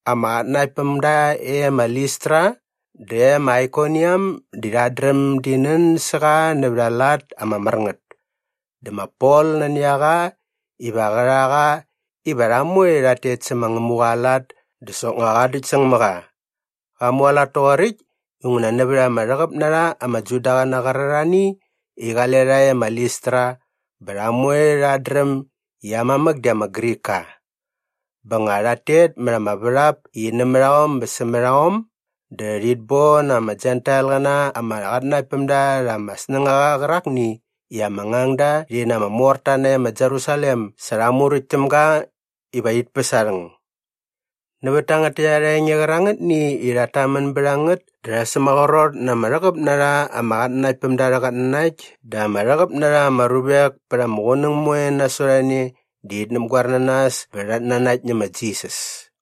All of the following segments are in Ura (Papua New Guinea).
Ama qatnanaktpämda e ma Listra dä e ma Aikoniam di rhat dräm di nän sä qa nävät aa lat ama mär ngät. Dä ma Pol nani a qa iva qä rha qa iva rha moe rhat tet sä ma Ngämuqa aa lat dä soknga qa däktsäng mä qa. Qa mualat toqoräkt inguna nävät ama rhäqäp na rha ama Judaqäna qärarhani i qale rha e ma Listra bä rha moe rhat dräm i aa mamäk di ama Grikka. Bä nga rhat tet mät ama värhap i nämät aom bä sämät aom dä rhit bon ama Jentailqäna ama qatnanaktpämda rha ama snängaqa qärakni i ama ngangda rhi na ama morta nae ma Jerusalem sa rha muräkt täm ga iva rhit päs aa rhäng. Nävät tangät täkt arha enge qärangätni i rhat tamän bät a ngät dä rha sämaqrot na ama rhäqäp na rha ama qatnanaktpämda arhä qatnanakt dä ama rhäqäp na rha ama ruvek pät ama qunäng moe nasot a ne di rhit näpgoer na nas bä rhat nanakt nä ma Jisas.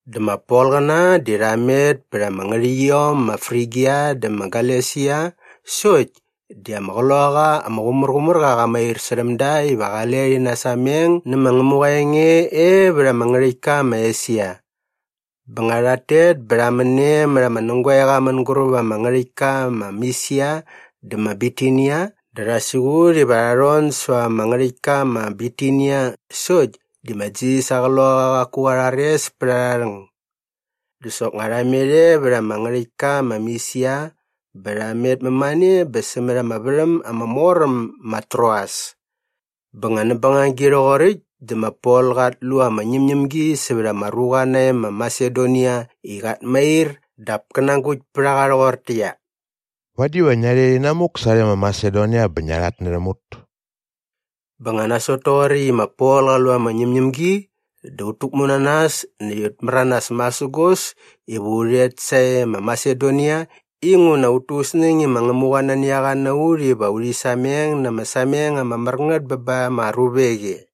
Dä ma Polqäna di rha met pät ama ngärhäqyiom ma Frigia dä ma Galesia sokt di ama Qloqaqa ama Qumärqumärqa qa mair särhäm da iva qale rhi nasameng nä ma Ngämuqa aa enge e vät ama ngärhäktka ma Esia. Bä nga rhat tet bä rha män e mät ama nägoeqa mänguräp ama ngärhäktka ma Misia dä ma Bitinia dä rha siqut iva rha rhon säva ama ngärhäktka ma Bitinia sokt di ma Jisas aa Qloqaqa qaku qa rhares pät arha rhäng. Dä soknga rha met e vät ama ngärhäktka ma Misia bä rha met mämane bä sämät ama värhäm ama mor äm ma Troas. Bä nga näp bängagi rhoqoräkt dä ma Pol qat lu ama ñämñämgi sävät ama ruqa nae ma Masedonia i qat mair dap kä nagukt pät a qa rhoqortäqyia, “Vadi va ngia rhet inamuk sarhe ma Masedonia bä ngia rhatnärhäm ut.” Bä nga nasot toqoräkt i ma Pol qa lu ama ñämñämgi dä ut täkmu na nas näkt ut märanas masägos iva u rhet sae ma Masedonia inguna ut tu ut snäng i ma Ngämuqa nani a qa na ut iva urhi sameng na ama sameng ama mär ngät bä ba ama ruvek e.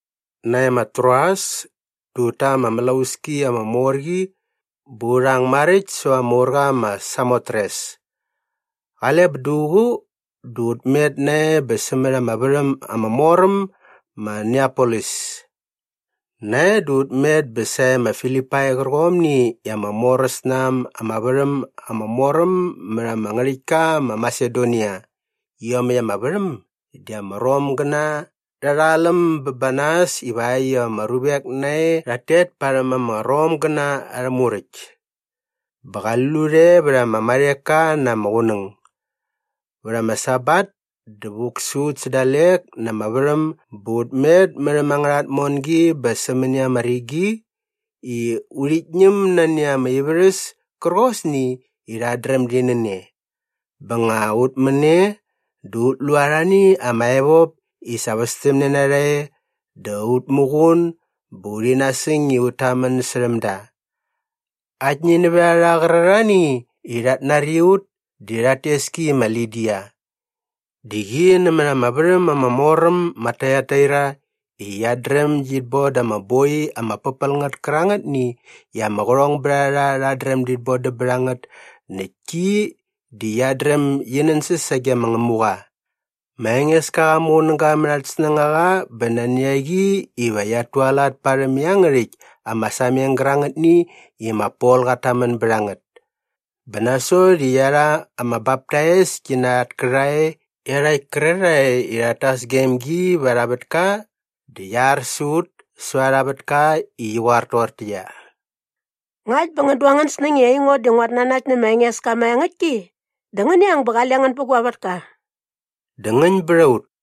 Nae ma Troas dä ut ta ama mlauski ama mor qi bä u rhang maräkt säva ama urqa ma Samotres. Qale bä duququ dä ut met nae bä sämät ama värhäm ama mor äm ma Neapolis. Nae dä ut met bä sae ma Filipai qärqomni i ama moräs na äm ama värhäm ama mor äm mät ama ngärhäktka ma Masedonia. Iomäkt ama värhäm di ama Romgäna rha rha läm bä ba nas ivakt iva ama ruvek nae rhat tet parhäm ama Romgäna arhä muräkt. Bä qali lut e vät ama marheka na ama qunäng. Vät ama Sabat dä vuk sä ut sä dalek na ama värhäm bä ut met mät äm angärha tmongi bä sämäni ama rigi i urhit ñäm nani ama ivärhäs kärqosni i rhat dräm di nän e. Bä nga ut män e dä ut lu arhani ama evop i sa västämne nä rha e dä ut muqun bä urhi nasäng i ut tamän särhäm da. Aktni nävät a rha qärarhani i rhat nari ut di rhat tes ki i ma Lidia. Di qi nämät ama värhäm ama mor äm ma Taiataira i qiat dräm git boda ama boi ama pärpäl ngät kärangätni i ama qärhongbärharha rhat dräm dit bodäm bät a ngät näkt ki di qiat dräm gi nänsäs sage ma Ngämuqa. Ma Engeska qa muqunäga mät at snängaqa bä nani a qi iva qiat tualat parhäm iangärhäkt ama sameng gärangätni i ma Pol qat tamän bät a ngät. Bä nasot i qia rha ama baptais ki na at kärhae iarhakt kärarhae i rhat tas gem gi va arha vätka dä qia ar sä ut säva arha vätka i qi qoar toqortäqyia, “Ngakt bä ngän du angän snäng i aingo di nguat nanakt nä ma Engeska maengäktki dä ngäni ang bä qale ngän bä gua vätka.” Dä ngäñ bät a ut.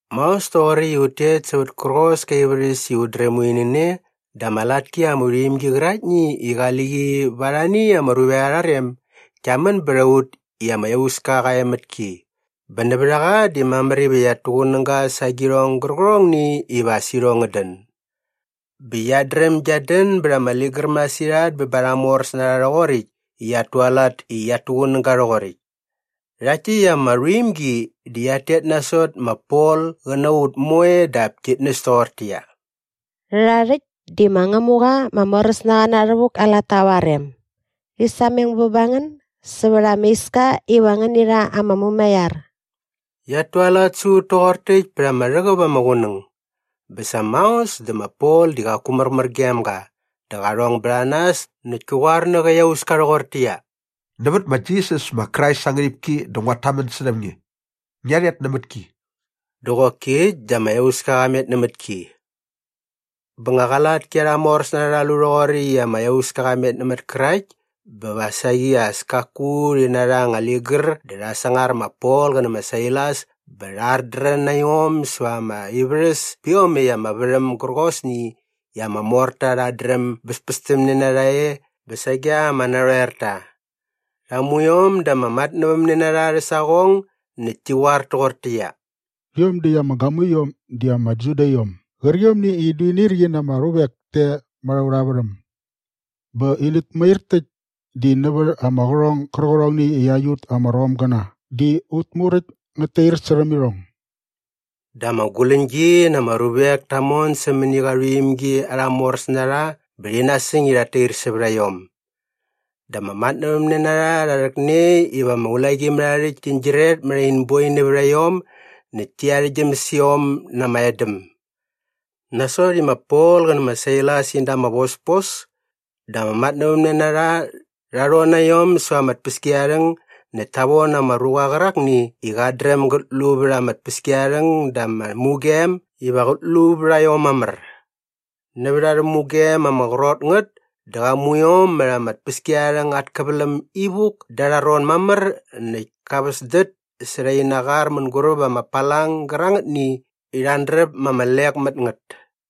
Maos toqoräkt i ut tet sävät kärqos kä ivärhäs i ut dräm urhi nän e dä ama latki ama rhuimgi qäraktni i qali qi va arhani ama ruvek arha rem gia män bät a ut i ama iauska qa e mät ki bä nävät a qa di mamär iva qiat tuqunäga sa agirhong gärqärhongni iva as irhong ngät dän. Bä qiat dräm giat dän bät ama ligär masirhat bä ba arha moräsnarha rhoqoräkt i qiat tualat i qiat tuqunäga rhoqoräkt. Rhakt täkt ama rhuimgi di qiat tet nasot ma Pol qä na ut moe dap kit näs toqortäqyia, “Rhärha rhäkt di ma Ngämuqa ma Moräsnaqa Na Rhävuk aa latta va aa rem. Rhi sameng bä ba ngän sävät ama iska iva ngäni rha ama mumaiar.” Qiat tualat sä ut toqor täkt pät ama rhäqäp ama qunäng. Bä sa maos dä ma Pol di qaku märmär gem ga dä qa rhong bät a nas näkt kä qoar nä qä iauska rhoqortäqyia, “Nävät ma Jisas ma Krais aa ngärhipki dä nguat tamän särhäm nge, ngia rhet nämät ki!” Dä qoki äkt dä ama iauska qa met nämät ki. Bä nga qa latki arha moräsnarha rha lu rhoqoräkt i ama iauska qa met näp kärakt bä va saqi as kaku rhi narha anga ligär dä rha sangar ma Pol qä nä ma Sailas bä rha ardrän na iom säva ama ivärhäs pä iomäkt ama värhäm gärqosni i ama morta rhat dräm bäspästämne na rha e bä sage ama narhoerta. Rha mu iom da ama matnävämnenarha arhä saqong näkt ti qoar toqortäqyia, “Rhiom däkt ama gamuiom di ama Judaiom gärqiomni i in duinirqi na ama ruvek te mät aurha värhäm bä inät mair täkt di nävät ama qärhong gärqärhongni i aiut ama Romgäna di ut muräkt ngät tair särhäm irhong.” Dä ama guläñgi na ama ruvek ta mon sämäni qa rhuimgi arha moräsnarha bä rhi nasäng i rhat tair sävät iom. Dä ama matnävämnenarha rha rhäkne iva ama ulaqimärharhärhäkt tin gyiret mät in boi nävät a iom näkt ti arhäktgyäm sä iom na ama edäm. Nasot i ma Pol qä nä ma Sailas in da ama vospos dä ama matnävämnenarha rha rhon na iom säva ama tpäskiarharhäng näkt ta von ama ruqa qärakni i qat dräm gät lu vät ama tpäskiarharhäng da ama mugem iva qät lu vät a iom mamär. Nävät arhä mugem ama qrot ngät dä qa mu iom mät ama tpäskiarharhäng at käväläm ivuk da arha ron mamär näkt ka väsdät särha ina qar mänguräp ama palang gärangätni i rha andräp ma ama lek mät ngät.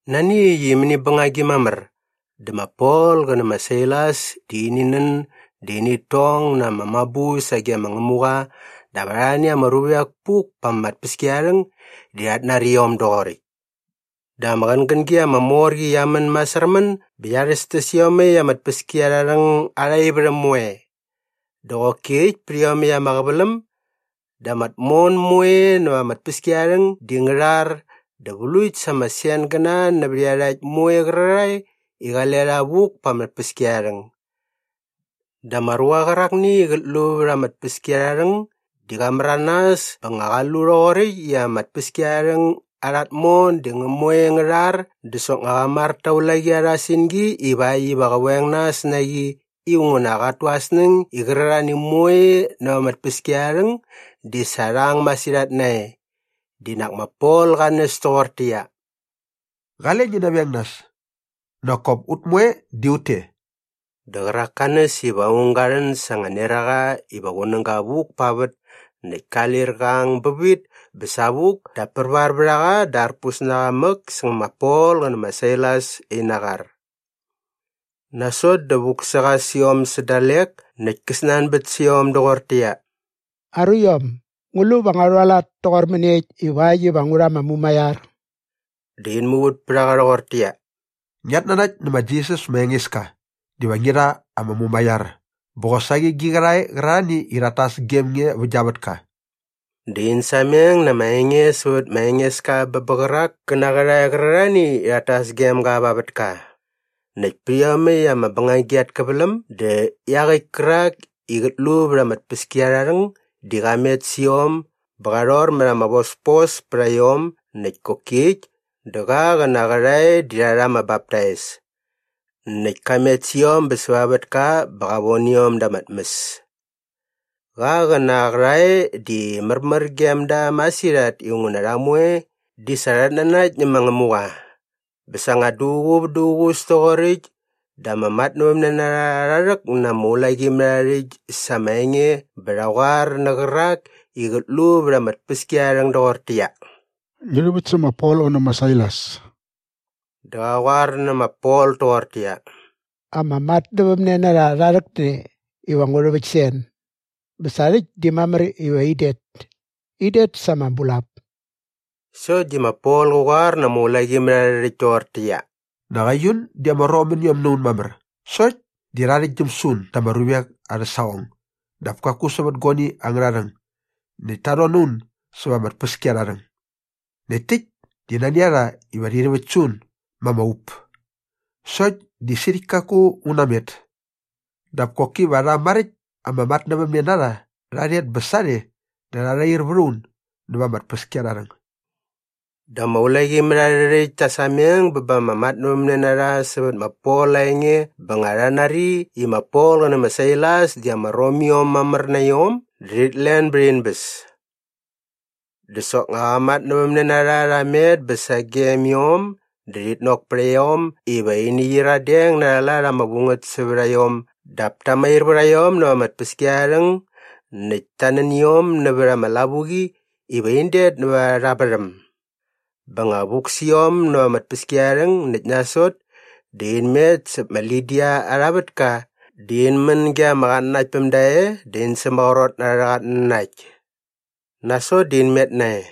Nani äkt i mäni bängagi mamär dä ma Pol qä nä ma Sailas di ini nän dä init tong na ama mabu sage ma Ngämuqa dap arhani ama ruvek puk pa ama tpäskiarharhäng di rhat nari iom doqoräkt. Dä ama qängängi ama mor qi qia män masärmän bä qia rhästäs iomäkt ama tpäskiarharhäng arha ivärhäm moe. Dä qoki äkt pät iomäkt ama qäväläm dä ama tmon moe näva ama tpäskiarharhäng di ngä rhar dä vlukt sa ama sengäna nävät iarhakt moe qärarhae i qale rha vuk pa ama tpäskiarharhäng. Dä ama ruqa qärakni i qät lu vät ama tpäskiarharhäng di qa märanas bä nga qa lu rhoqoräkt i ama tpäskiarharhäng arha tmon di ngä moe ngä rhar dä soknga qa mar ta ulaqi arha singi ivakt iva qä veng nas na qi inguna qat tu aa snäng i qärarhani moe näva ama tpäskiarharhäng di sa rha ang masirhat nae. Di nak ma Pol qa näs toqortäqyia, “Qale ngi naveng nas. Nak kop ut moe di ut te.” Dä qärak ka näs iva aung ga rhän sa anga neraqa iva qunäga vuk pa vät näkt ka lir qa ang bävit bä savuk dap pärvar vät a qa dä arpus na qa mäk säng ma Pol qä nä ma Sailas ina qar. Nasot dä vuk sä qa sä iom sä dalek näkt kä snanbät sä iom doqortäqyia, “Aruiom, ngu lu va ngua rhualat toqor mäniekt ivakt iva ngu rha ama mumaiar?” Dä in muvät pät a qa rhoqortäqyia, “Ngiat nanakt nä ma Jisas ma Engeska diva ngi rha ama mumaiar bä qosaqi gi qärhae qärarhani i rhat tas gem nge vä gia vätka.” Dä in sameng na ama enge sävät ma Engeska bä bä qärak kä na aa qärhae qärarhani i rhat tas gem ga va aa vätka. Näkt pät iomäkt ama bängagi at käväläm dä iaqäkt kärak i qät lu vät ama tpäskiarharhäng di qa met sä iom bä qa rhor mät ama vospos pät a iom näkt koki äkt dä qa qä na aa qärhae di rha rha ama baptais. Näkt ka met sä iom bä säva aa vätka bä qa von iom da ama tmäs. Qa qä na aa qärhae di märmär gem da masirhat inguna rha moe di sa rhat nanakt nä ma Ngämuqa. Bä sa nga duququ vät duququs toqoräkt dä ama matnävämnenarha rha rhäk na ama ulaqimärharhärhäkt sa ama enge bä rha qoar nä qärak i qät lu vät ama tpäskiarharhäng doqortäqyia, “Ngi rhäväkt sä ma Pol qä nä ma Sailas.” Dä qa qoar nä ma Pol toqortäqyia, “Ama matnävämnenarha rha rhäkne iva ngu rhäväkt sä en. Bä sa rhäkt di mamär iva in det. In det sa ama bulap.” Sokt di ma Pol qä qoar na ama ulaqimärharhärhäkt toqortäqyia, “Nak aiun di ama Romiom na un mamär sokt di rha arhäktgyäm sä un da ama ruvek arhä saqong dap kaku sävät guani angärha rhäng näkt ta rhon na un säva ama tpäskiarharhäng. Näkt täkt di nani a rha iva rhit täväkt sä un ma ama up. Sokt di sirhäkt kaku un namet. Dap koki va rha maräkt ama matnävämnenarha rha rhet bä sarhe dä rha rhair vät a un näva ama tpäskiarharhäng.” Dä ama ulaqimärharhärhäkt ta sameng bä ba ama matnävämnenarha sävät ma Pol aa enge bä nga rha nari i ma Pol qä nä ma Sailas di ama Romiom mamär na iom dä rhit len bät in bäs. Dä soknga qä matnävämnenarha rha met bä sagem iom dä rhit nok pät a iom iva ini qyiradeng na arha lat ama vu ngät sävät a iom dap ta mair vät a iom näva ama tpäskiarharhäng näkt ta nän iom nävät ama lavuqi iva in det näva arha värhäm. Bä nga vuk sä iom näva ama tpäskiarharhäng näkt nasot dä in met säp ma Lidia arha vätka dä in män ge ama qatnanaktpämda e dä in sämaqrot na arhä qatnanakt. Nasot dä in met nae.